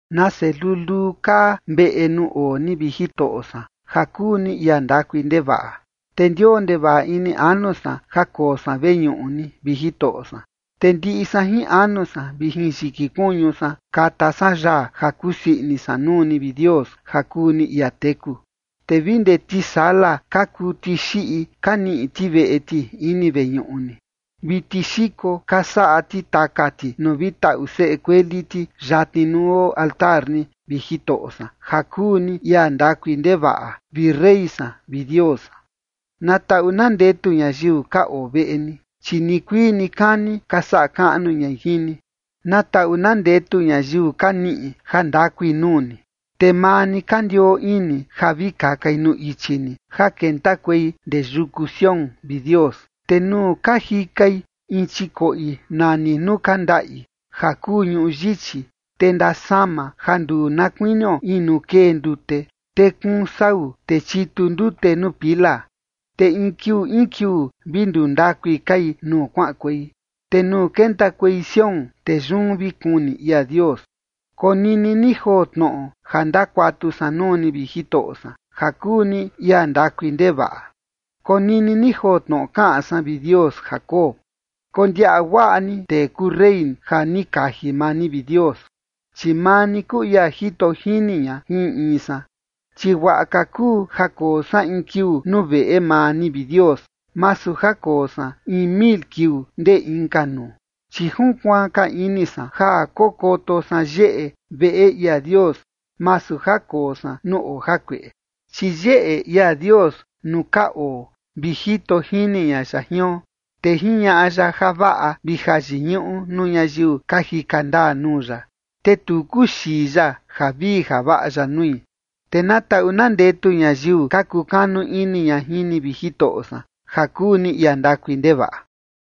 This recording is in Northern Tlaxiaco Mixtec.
Nase luluu kaa veꞌe nuu oo ni, vi Jitoꞌo san, ja kuu ni ia ndakui ndevaꞌa. Te ndioo ndevaꞌa ini anu san ja koo san veñuꞌu ni, vi Jitoꞌo san, te ndiꞌi san jin anu san vi jin yiki kuñu san kata san yaa ja kusii ini san nuu ni, vi Dios, ja kuu ni ia teku. Te vi ndee tisala ka kuu tixiꞌi ka niꞌi ti veꞌe ti ini veñuꞌu ni, vi tixiko ka saꞌa ti taka ti nuu vi taꞌu seꞌe kueli ti yatni nuu oo altar ni, vi Jitoꞌo san, ja kuu ni ia ndakui ndevaꞌa, vi rey san vi Dios san. Na taꞌu na ndetu ñayiu ka oo veꞌe ni, chi nikuii nikani ka saꞌa kaꞌnu ñai jin ni. Na taꞌu na ndetu ñayiu ka niꞌi jandakui nuu ni, te maa ni ka ndioo ini ja vi kakai nuu ichi ni ja kentakuei ndee yuku Sión, vi Dios. Te nuu ka jikai in chikoꞌi nani “nuu ka ndaꞌi” ja kuu ñuꞌu yichi, te ndasama ja nduu na kuinio in nuu kee ndute, te kuun sau, te chitu ndute nuu pila. Te in kiuu in kiuu vi nduu ndakui kai nuu kuaꞌankuei, te nuu kentakuei Sión, te yun vi kuni ia Dios. Konini ni joo tnoꞌo ja ndakuatu san nuu ni, vi Jitoꞌo san, ja kuu ni ia ndakui ndevaꞌa. Konini ni joo tnoꞌo kaꞌan san, vi Dios Jacob. Kondiaꞌa guaꞌa ni tee kuu rey ja ni kaji maa ni, vi Dios, chi maa ni kuu ia jito jini ña jin in in san. Chi guaꞌa ka kuu ja koo san in kiuu nuu veꞌe maa ni, vi Dios, masu ja koo san in mil kiuu ndee inka nuu. Chi junkuaan ka ini san ja kokoto san yeꞌe veꞌe ia Dios, masu ja koo san nuu oo jakueꞌe. Chi yeꞌe ia Dios nuu ka oo vi jito jini ña ya jion. Te jiñaꞌa ya javaꞌa vi jayiñuꞌu nuu ñayiu ka jika ndaa nuu ya, te tu kuxii ya javii javaꞌa ya nui. Te na taꞌu na ndetu ñayiu ka kukanu ini ña jin ni, vi Jitoꞌo san, ja kuu ni ia ndakui ndevaꞌa.